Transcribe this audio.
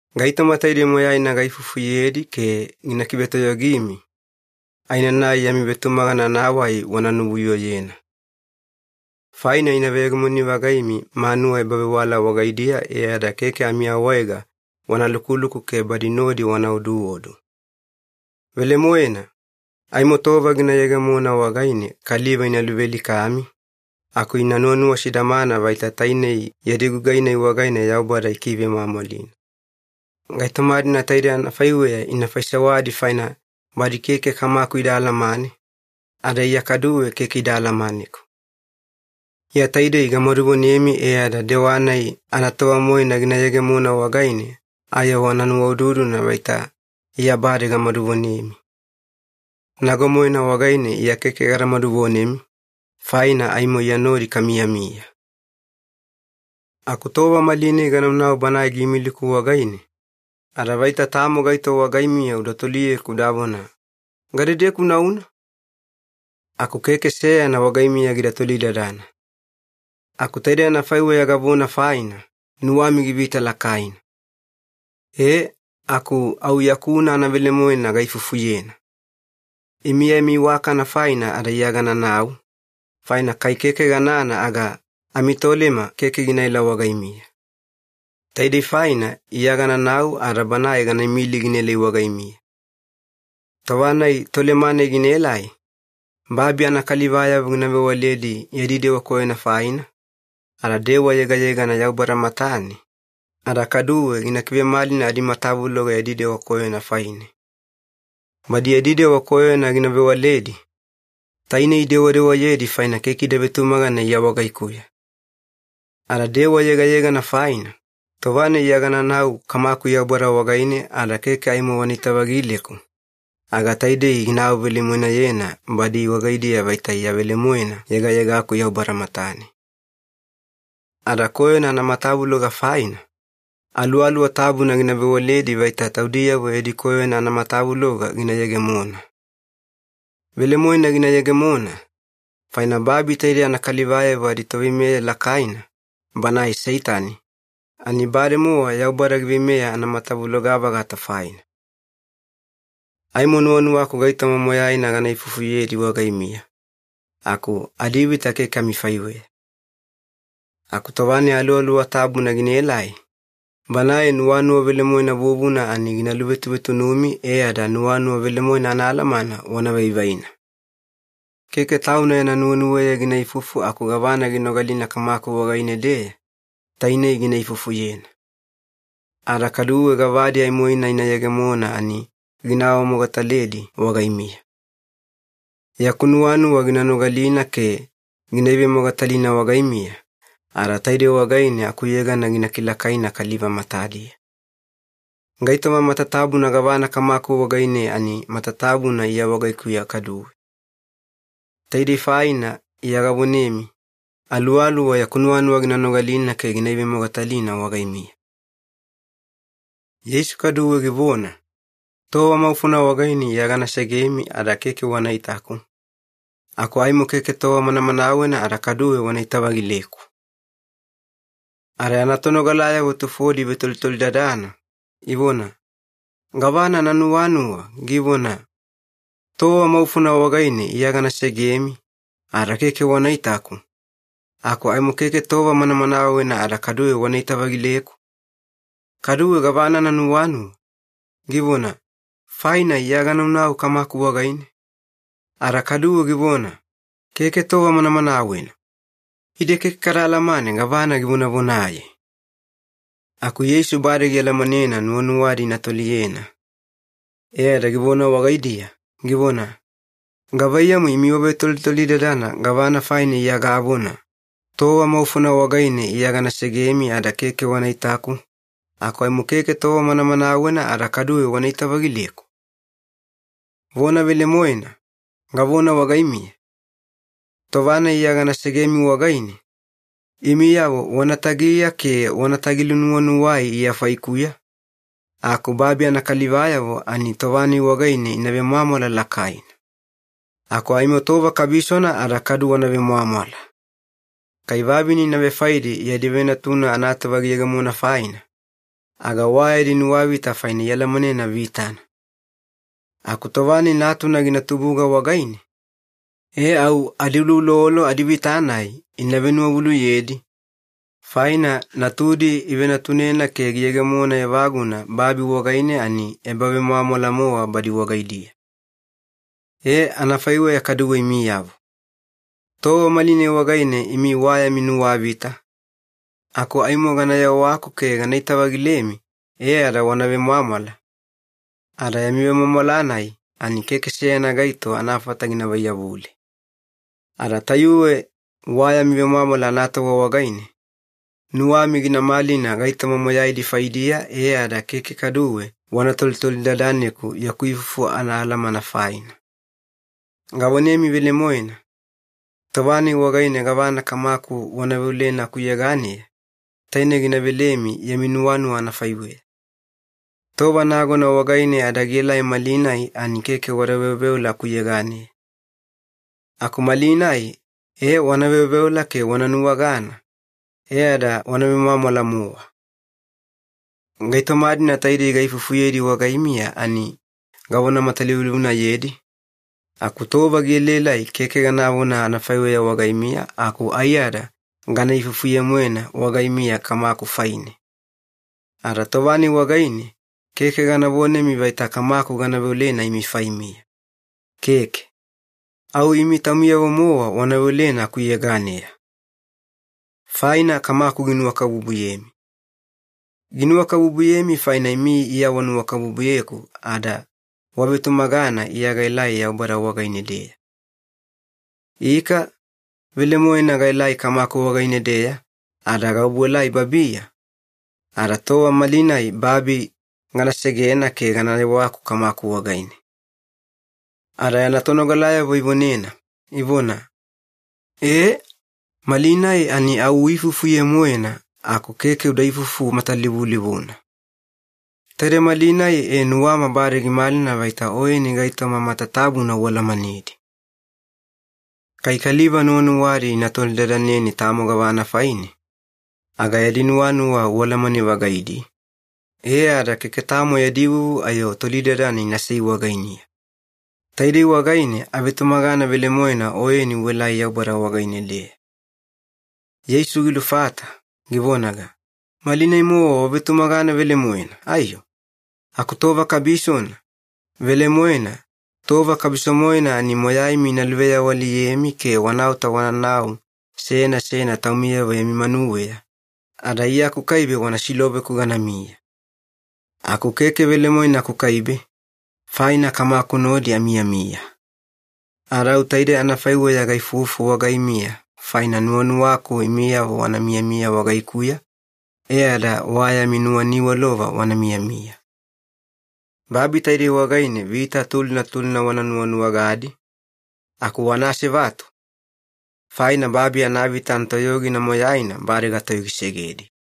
“Gaitoma taidei moyaina gaifufuyedi ke gina kivetoyogimi, aenanai yami vetumagana anawai wana nuvuyoyena. Faina ina veyegemoni-vagaimi manuwa ebavewala wagaidiya e ada keke amiawaega wana lukuluku ke badi nodi wana oduodu. Velemoena, aimo tova gina yegemona wagaine kaliva ina luvealikami, aku ina nuwanuwa sidamana vaita tainei yadi gugai-nai wagaine Yaubada ikivemwamwalina. Gaitoma-dina taidei anafaiweya ina faisewadi faina badi keke Kamaku ida alamane, ada Iya kaduwe keke ida alamaneku. Iya taidei gamaduvonemi e ada dewa-nai anatova-moena gina yegemona wagaine ayo wana nuwaududuna vaita Iya bade gamaduvonemi. Nago-moena wagaine Iya keke gada maduvonemi, faina aimo Iya nodi kamiyamiya. “Aku tova malinai ganaunau Banae giimiliku wagaine, ada vaita tamo gaito wagaimiya uda toliyeku udavona, ‘Gadedeku unauna?’ Aku keke seyana wagaimiya gida tolidadana. Aku taidei anafaiweya gavona faina, nuwami givita lakaina. E aku au yakuna anavelemoena gaifufuyena. Imi yami iwakana faina ada Iya gananau, faina kai keke ganana aga amiTolema keke ginaela wagaimiya. Taidei faina Iya gananau ada Banae gana imili ginaelai wagaimiya. Tova-nai Tolema-nai ginaelai, babi anakalivayavo gina vewaledi yadi dewa koyona faina, ada dewa yegayegana Yaubada matane, ada kaduwe gina kivemalina adimatavuloga yadi dewa koyona faine. Badi yadi dewa koyona gina vewaledi, tainei idewadewayedi faina keke ida vetumagana Iya wagaikuya. Ada dewa yegayegana faina, tova-nai Iya gananau Kamaku Yaubada wagaine ada keke aimo wanaita-vagileku, aga taidei gina awavelemoenayena badi wagaidiya vaita Iya velemoena yegayegaku Yaubada matane. Ada koyona anamatavuloga faina, Aluwaluwa Tabuna gina vewaledi vaita taudiyavo yadi koyona anamatavuloga gina yegemona. Velemoena gina yegemona, faina babi taide anakalivayavo aditoveimeya lakaina, banae Seitani, ani bademowa Yaubada giveimeya anamatavuloga-vagata faina. “Aimo nuwanuwaku gaitoma moyaina gana ifufuyedi wagaimiya, aku adivita keke amifaiweya. Aku tova-nai Aluwaluwa Tabuna ginaelai, Banae nuwanuwa velemoena vuvuna, ani gina luvetuvetunumi e ada nuwanuwa velemoena anaalamana wana vaivaina. Keke tauna yana nuwenuweya gina ifufu aku gavana ginogalina Kamaku wagaine-deya, tainei gina ifufuyena. Ada kaduwe gavadi aimoina ina yegemona ani gina awamogataledi wagaimiya. Yaku nuwanuwa gina nogalina ke gina ivemogatalina wagaimiya, ada taidei wagaine akuyegana gina kilakaina kaliva matadiya. Gaitoma matatabuna gavana Kamaku wagaine ani matatabuna Iya wagaikuya kaduwe. Taidei faina Iya gavonemi, Aluwaluwa yaku nuwanuwa gina nogalina ke gina ivemogatalina wagaimiya.” Yeisu kaduwe givona, “Tova maufona wagaine Iya gana segemi ada keke wana itaku, aku aimo keke tova manamanawena ada kaduwe wanaita-vagileku.” Ada yana tonogalayavo tufodi ivetolitolidadana, ivona, “Gavana ananuwanuwa, givona, ‘Tova maufona wagaine Iya gana segemi ada keke wana itaku, aku aimo keke tova manamanawena ada kaduwe wanaita-vagileku’? Kaduwe gavana ananuwanuwa, givona, ‘Faina Iya ganaunau Kamaku wagaine’? Ada kaduwe givona, ‘Keke tova manamanawena’. Ide keke kada alamane gavana givonavonaye.” Aku Yeisu bade gialamanena nuwanuwadi ina toliyena, e ada givona wagaidiya, givona, “Gavaiyamu imi wavetolitolidadana gavana faina Iya gavona, ‘Tova maufona wagaine Iya gana segemi ada keke wana itaku, aku aimo keke tova manamanawena ada kaduwe wanaita-vagileku’? Vona velemoena, gavona wagaimiya, tova-nai Iya gana segemi wagaine, imiyavo wana tagiya ke wanatagi-lunuwanuwai Iya faikuya, aku babi anakalivayavo ani tova-nai wagaine ina vemwamwala lakaina. Aku aimo tova kabisona ada kadu wana vemwamwala. Kai vavine ina vefaedi yadi venatuna anatova giyegemona faina, aga wa yadi nuwavita faina ialamanena vitana. Aku tova-nai natuna gina tubuga wagaine, e au adiuloulolo adivita-nai ina venuwavuluyedi, faina natudi ivenatunena ke giyegemona evaguna babi wagaine ani ebavemwamwala-mowa badi wagaidiya. Ee, anafaiweya kaduwe imiyavo. Tova malinai wagaine imi wa yami nuwavita, aku aimo gana yewaku ke ganaita-vagilemi e ada wana vemwamwala, ada yami vemwamwala-nai ani keke seyana gaito anafata gina vaiyavule. Ada tayuwe wa yami vemwamwala anatova wagaine, nuwami gina malina gaitoma moyaidi faidiya e ada keke kaduwe wana tolitolidadaneku yaku ifufu anaalamana faina. Gavonemi velemoena, tova-nai wagaine gavana Kamaku wana veolena akuyeganeya, taine gina velemi yami nuwanuwa anafaiweya. Tova nagona wagaine ada gielai malinai ani keke wada veoveola akuyeganeya. Aku malinai ee wana veoveola ke wana nuwagana, e ada wana vemwamwala-mowa. “Gaitoma-dina taidei gaifufuyedi wagaimiya ani gavona matalivulivunayedi, aku tova gielaelai keke ganavona anafaiweya wagaimiya aku aiyada gana ifufuye-moena wagaimiya Kamaku faine. Ada tova-nai wagaine keke gana vonemi vaita Kamaku gana veolena imi faimiya. Keke. Au imi taumiyavo-mowa wana veolena akuyeganeya. Faina Kamaku ginuwakabubuyemi. Ginuwakabubuyemi faina imi Iya wanuwakabubuyeku ada wavetumagana Iya gaelai Yaubada wagaine-deya. Ika, velemoena gaelai Kamaku wagaine-deya ada gaobuelai babiya, ada tova malinai babi gana segena ke gana yewaku Kamaku wagaine.” Ada yana tonogalayavo ivonena, ivona, “E, malinai ani au uifufuye-moena aku keke uda ifufu matalivulivuna. Taide malinai e nuwama bade gimalina vaita Oyeni gaitoma matatabuna ualamanedi. Kai kaliva nuwanuwadi ina tolidadaneni tamo gavana faine, aga yadi nuwanuwa ualamane-vagaidi, e ada keke tamo yadi vuvu ayo tolidadana inasei wagainiya. Taidei wagaine avetumagana velemoena Oyeni uelai Yaubada wagaine-deya.” Yeisu gilufata, givonaga, “Malinai-mowa wavetumagana velemoena, aiyo? Aku tova kabisona, velemoena tova kabiso-moena ani moyaimi ina luveawaliyemi ke wanaota wananau seyana seyana taumiyavo yami manuweya, ada Iya akukaibe wana siloveku ganamiya. Aku keke velemoena akukaibe, faina Kamaku nodi amiyamiya. Ada au taidei anafaiweya gaifufu wagaimiya faina nuwanuwaku imiyavo wana miyamiya wagaikuya e ada wa yami nuwaniwalova wana miyamiya. Babi taidei wagaine vita tulina tulina wana nuwanuwagadi, aku wana asevatu, faina babi anavita anatoyogina moyaina bade gatoyogisegedi.”